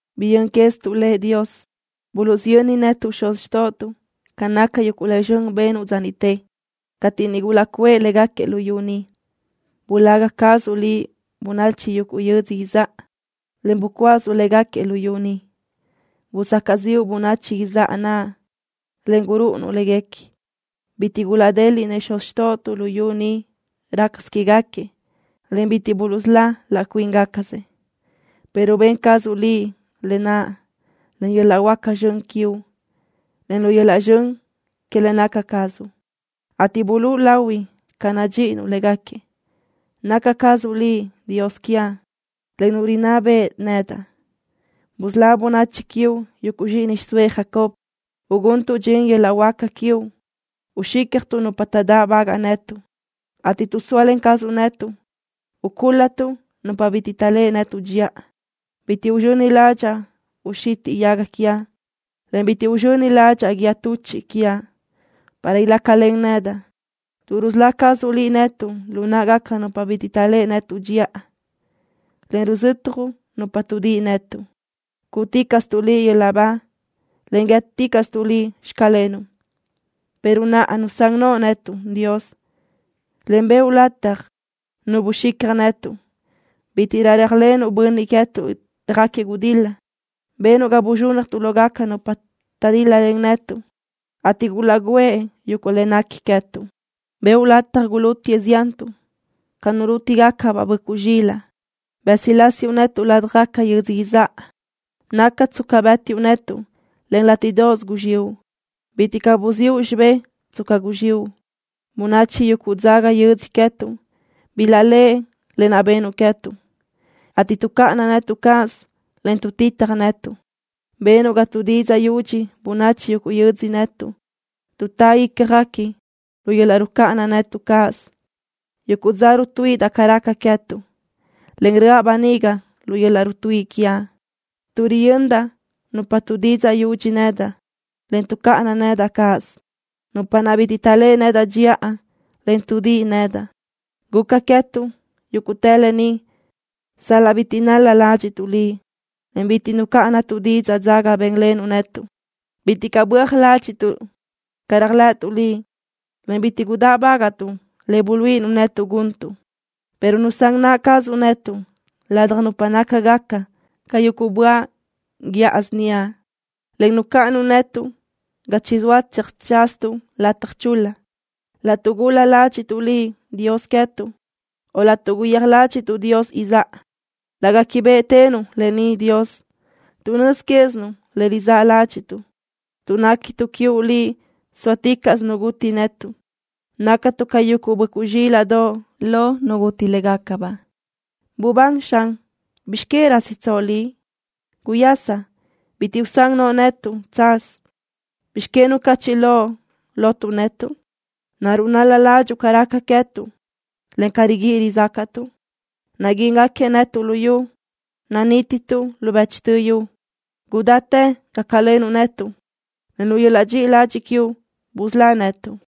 Biyö́n quézituʼ le, Dios. Buluʼsiyönnëʼ netuʼ xuz xtóʼotuʼ ca naca yuguʼ le zxön benuʼ dza niʼte, cateʼ niʼ gulaʼcuʼë légaquiëʼ luyú ni. Bulaga cazuʼ Liʼ bönachi yuguʼ yödzö izáʼa, en bucuásuʼ légaquiëʼ luyú ni. Busacaʼ ziʼu bönachi izáʼa naʼ, en gurúʼunuʼ léguequi. Bitiʼ gulaʼdéliʼnëʼ xuz xtóʼotuʼ luyú ni rácasö quégaquiëʼ, en bitiʼ buluʼsölá laʼ cuíngacasëʼ, pero ben cazuʼ Liʼ lë naʼ len yöl-laʼ huáca zxön quiuʼ, en lu yöl-laʼ zxön que le naca cazuʼ, ateʼ bulúʼu lahui ca nadxíʼinuʼ légaquiëʼ. Naca cazuʼ Liʼ Dios quiaʼ, en Nu rinná beʼe nedaʼ. Busölá bönachi quiuʼ, yuguʼ zxíʼini xiʼsóëʼ Jacob. Uguntuʼ dxin yöl-laʼ huáca quiuʼ, uxícjatuʼ nupa taʼdáʼbagaʼ netuʼ, ateʼ tuʼ zóalen cazuʼ netuʼ, ucúl-latuʼ nupa bitiʼ taʼléʼe netuʼ dxiʼa. Bitiʼ uzxöni ládxaʼa uxitiʼ yaga quiaʼ, en bitiʼ uzxöni ládxaʼa guíë tuchiʼ quiaʼ para ilácalen nedaʼ, tuʼ rusölá cazuʼ Liʼ netuʼ lu náʼagaca nupa bitiʼ taʼléʼe netuʼ dxiʼa, en ruzötjuʼ nupa tuʼdíʼi netuʼ. Cúʼuticaʼstuʼ Liʼ yöl-laʼ ba, en guíëticaʼstuʼ Liʼ: “Xclenuʼ.” Pero naʼa nusán noʼo netuʼ, Dios, en bëʼu lataj nu buxicja netuʼ. Bítiʼrö réajlenuʼ bönniʼ queë́tuʼ röjáquiëʼ gudil-la. Benuʼ ga buzxúnnajtuʼ lógaca nupa taʼdíl-lalen netuʼ, ateʼ gulaʼgǘëʼ yuguʼ le nequi queë́tuʼ. Bëʼu lataj gulútiëʼ ziantuʼ ca nu rúti-gacabaʼ böʼcuʼ zxilaʼ. Bësilásiuʼ netuʼ ládjagaca yödzö izáʼa. Naca tsca bë́tiʼu netuʼ, en látiʼdoʼos guzxiʼu. Bitiʼ caʼ buziʼu xibé tsca guzxiʼu. Bönachi yuguʼ dzaga yödzö queë́tuʼ bilaʼléʼe lë naʼ benuʼ queë́tuʼ, ateʼ tuʼcáʼana netuʼ cáʼasö, en tuʼtitaj netuʼ. Benuʼ ga tuʼdidzaʼ yudxi bönachi yuguʼ yödzö netuʼ. Tuʼtá ícjaguequi lu yöl-laʼ rucáʼana netuʼ cáʼasö. Yuguʼ dza rutuíʼidaʼ ca raca queë́tuʼ, en röʼa böniga lu yöl-laʼ rutuíʼi quiaʼ, tuʼ riyöndaʼ nupa tuʼdidzaʼ yudxi nedaʼ, en tuʼcáʼana nedaʼ cáʼasö, nupa naʼ bitiʼ taʼléʼe nedaʼ dxiʼa, en tuʼdíʼi nedaʼ. Guca queë́tuʼ yúguʼtë lë ni sal-laʼ bitiʼ nál-la ládxiʼtuʼ Liʼ, en bitiʼ nucáʼanatuʼ didzaʼ dzaga bénlenuʼ netuʼ. Bitiʼ caʼ böaj ládxiʼtuʼ ca réajlëʼëtuʼ Liʼ, en bitiʼ gudáʼbagaʼtuʼ le buluíʼinuʼ netuʼ guntuʼ. pero nusán naʼ cazuʼ netuʼ ladaj nupa nácagaca ca yuguʼ böaʼ guiʼa síniaʼ, en nucáʼanuʼ netuʼ ga chizóa tseajtsázatuʼ lataj chul-la. Laʼtuʼ gul-la ládxiʼtuʼ Liʼ, Dios queë́tuʼ, o laʼtuʼ guyéaj ládxiʼtuʼ tu dios izáʼa, laʼ gáquibeʼetënuʼ lë ni, Dios, tuʼ nöz quézinuʼ le rizáʼ ládxiʼtuʼ. Tuʼ néquituʼ quiuʼ Liʼ zóaticaʼsö nu guti netuʼ. Nactuʼ ca yuguʼ böʼcuʼ zxílaʼdoʼ lo nu guti légacabaʼ. ¡Bubán, Xan! ¿Bizx que rásitsoʼ Liʼ? ¡Guyasa! ¡Bitiʼ usán noʼo netuʼ chadía chacanna! ¿Bizx que nucachiʼ loʼ lotuʼ netuʼ? ¿Naruʼ nál-la ládxuʼu ca raca queë́tuʼ, en ca riguíʼi rizácaʼtuʼ? Naguíngaquiëʼ netuʼ luyú. Nadínituʼ lu bëchtö yu. ¡Gudáchi gácalenuʼ netuʼ, en lu yöl-laʼ dxiʼi ladxiʼ quiuʼ busölá netuʼ!